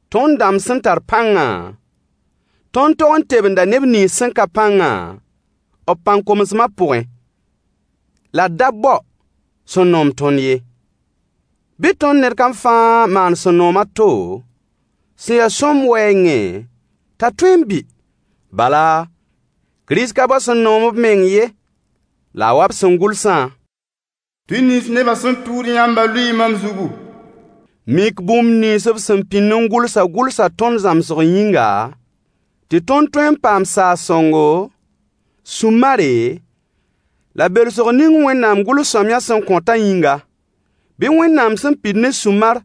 Tõnd dãmb sẽn tar pãngã, tõnd tog n tebenda neb nins sẽn ka pãngã b pãn-komsmã pʋgẽ, la d da bao sẽn noom tõnd ye. Bɩ tõnd ned kam fãa maan sẽn noom a to, sẽn ya sõmb wɛɛngẽ, t'a tõe n bɩ. Bala, Kirist ka bao sẽn noom b meng ye, la a wa b sẽn gʋlsã: Tʋy nins nebã sẽn tʋʋd yãmbã lʋɩɩ mam zugu. Mik bũmb nins b sẽn pĩnd n gʋlsã gʋlsa tõnd zãmsg yĩnga, tɩ tõnd tõe n paam saag-sõngo, sũ-mare la belsg ning Wẽnnaam gʋls-sõamyã sẽn kõtã yĩnga. Bɩ Wẽnnaam sẽn pid ne sũ-mar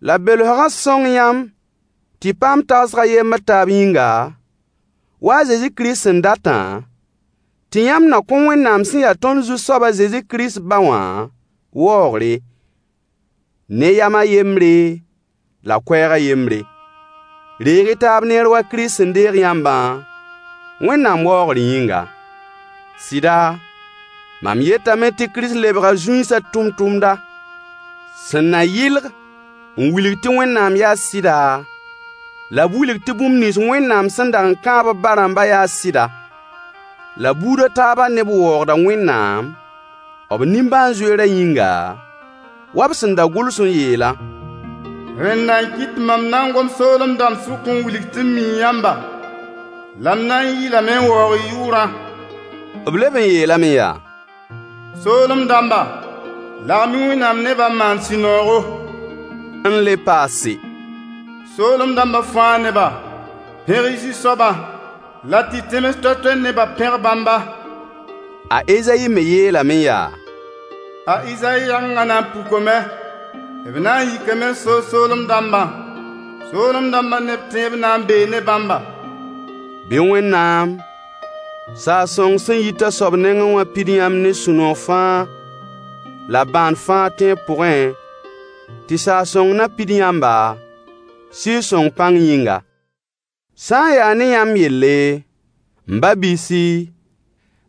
la belsgã sõng yãmb tɩ y paam tagsg a yembr taab yĩnga, wa a Zezi Kirist sẽn datã, tɩ yãmb na kõ Wẽnnaam sẽn ya tõnd Zu-soab a Zezi Kirist ba wã waoogre, ne yam a yembre la koɛɛg a yembre. Reeg-y taab neer wa Kirist sẽn deeg yãmbã, Wẽnnaam waoogr yĩnga. Sɩda, mam yetame tɩ Kirist lebga zũinsã tʋmtʋmda, sẽn na yɩlg n wilg tɩ Wẽnnaam yaa sɩda, la b wilg tɩ bũmb nins Wẽnnaam sẽn dag n kãab b ba-rãmbã yaa sɩda. La buud a taabã neb waoogda Wẽnnaam, b nimbãan-zoeerã yĩnga, wa b sẽn da gʋls n yeelã: Rẽnda n kɩt tɩ mam na n gom soolem dãmb sʋk n wilg tɩ m mii yãmba, la m na n yɩɩlame n waoog y yʋʋrã. B leb n yeelame yaa: Soolem dãmbã, lagem-y Wẽnnaam nebã n maan sũ-noogo. N le paase, soolem dãmbã fãa neba, pẽg-y Zu-soabã, la tɩ tẽms toay-toay nebã pẽg bãmba. A Ezayi me yeelame yaa: A Izayi yagengã na n pukame. B na n yikame n soog soolem dãmbã. Soolem dãmbã neb tẽeb na n bee ne bãmba. Bɩ Wẽnnaam, saag-sõng sẽn yit a soab nengẽ wã pid yãmb ne sũ-noog fãa la bãan fãa tẽeb pʋgẽ, tɩ saag-sõng na pid yãmba, Sɩɩg-sõng pãng yĩnga. Sã n yaa ne yãmb yelle, m ba-biisi,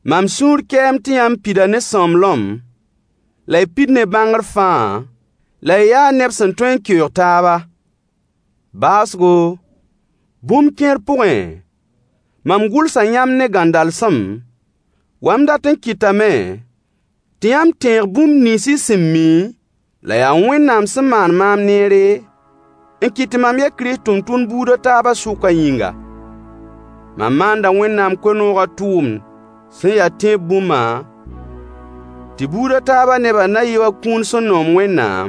mam sũur kɛɛm tɩ yãmb pida ne sõmblem, la y pid ne bãngr fãa, la y yaa neb sẽn tõe n keoog taaba. Baoosgo, bũmb kẽer pʋgẽ, mam gʋlsa yãmb ne gãndalsem, wa m dat n kɩtame tɩ yãmb tẽeg bũmb nins y sẽn mi, la yaa Wẽnnaam sẽn maan maam neere, n kɩt tɩ mam ya Kirist tʋmtʋmd buud a taabã sʋkã yĩnga. Mam maanda Wẽnnaam koe-noogã tʋʋmd sẽn ya tẽeb bũmbã, tɩ buud a taabã nebã na yɩ wa kũun sẽn noom Wẽnnaam,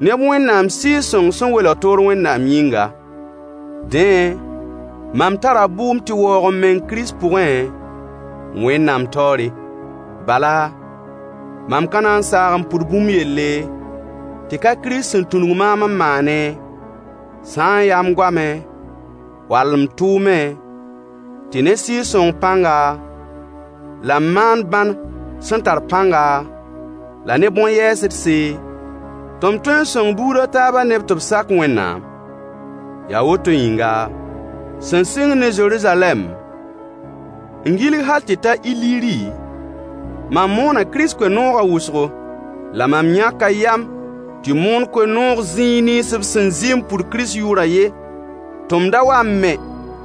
neb Wẽnnaam Sɩɩg-sõng sẽn welg toor Wẽnnaam yĩnga. Dẽ, mam tara bʋʋm tɩ waoog m meng Kirist pʋgẽ, Wẽnnaam taoore. Bala, mam ka na n saag n pʋd bũmb yelle, tɩ ka Kirist sẽn tũnug maam n maane, sã n yaa m goamẽ, wall m tʋʋmẽ, tɩ ne Sɩɩg-sõng pãnga, la m maan bãn sẽn tar pãnga, la ne bõn-yɛɛsdse, tɩ m tõe n sõng buud a taabã neb tɩ b sak Wẽnnaam. Yaa woto yĩnga, sẽn sɩng ne Zeruzalɛm, n gilg hal tɩ ta Iliri, mam moona Kirist koe-noogã wʋsgo. La mam yãka yam tɩ moon koe-noog zĩis nins b sẽn zɩ n pʋd Kirist yʋʋrã ye, tɩ m da wa n me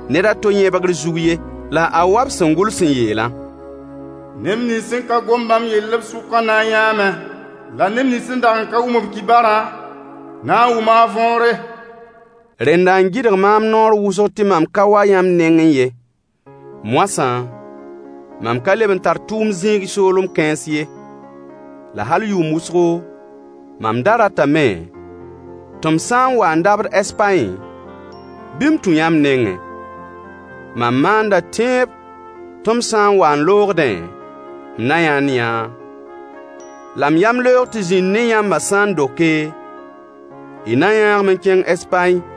ned a to yẽbgr zug ye. La a wa b sẽn gʋls n yeelã: Neb nins sẽn ka gom bãmb yell b sʋkã na n yãame, la neb nins sẽn dag n ka wʋm b kibarã, na n wʋma a võore. Rẽnda n gɩdg maam naoor wʋsg tɩ mam ka wa yãmb nengẽ ye. Moasã, mam ka leb n tar tʋʋm zĩig soolem kãens ye. La hal yʋʋm wʋsgo, mam da ratame tɩ m sã n wa n dabd Ɛspaẽ, bɩ m tũ yãmb nengẽ. Mam maanda tẽeb tɩ m sã n wa n loogdẽ, m na yãnd-yã, la m yamleoog tɩ zĩnd ne yãmbã sã n doke, y na yãag-m n kẽng Ɛspaẽ.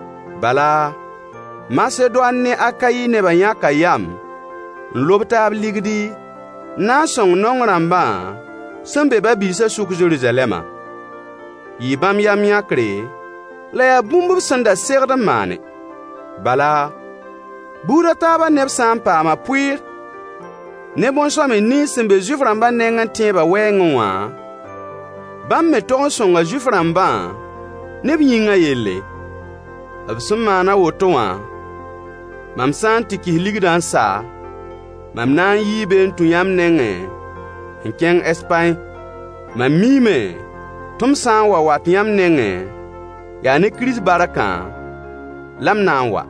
Bala, Masedoan ne Akayi nebã yãka yam n lob taab ligdi n na n sõng naong rãmbã sẽn be ba-biisã sʋk Zeruzalɛmã. Yɩɩ bãmb yam-yãkre, la yaa bũmb b sẽn da segd n maane. Bala, buud a taabã neb sã n paama pʋɩɩr ne bõn-sõamy nins sẽn be Zuif-rãmba nengẽ tẽeba wɛɛngẽ wã, bãmb me tog n sõnga Zuif-rãmbã ne b yĩngã yelle. B sẽn maan a woto wã, mam sã n tɩ kɩs ligdã n sa, mam na n yii be n tũ yãmb nengẽ n kẽng Ɛspaẽ. Mam miime tɩ m sã n wa wat yãmb nengẽ, yaa ne Kirist barkã la m na n wa.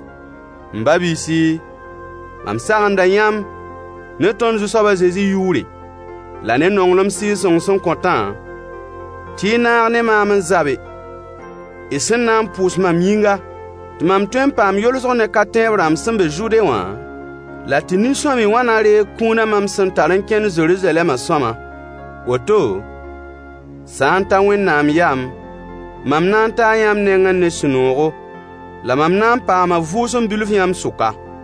M ba-biisi, mam sagenda yãmb ne tõnd Zu-soab a Zezi yʋʋre, la ne nonglem Sɩɩg-sõng sẽn kõtã, tɩ y naag ne maam n zabe, y sẽn na n pʋʋs mam yĩnga, tɩ mam tõe n paam yolsg ne ka-tẽeb rãmb sẽn be Zude wã, la tɩ nin-sõamy wã na reeg kũunã mam sẽn tar n kẽnd Zeruzalɛmã sõama. Woto, sã n ta Wẽnnaam yam, mam na n taa yãmb nengẽ ne sũ-noogo, la mam na n paama vʋʋsem bilf yãmb sʋka.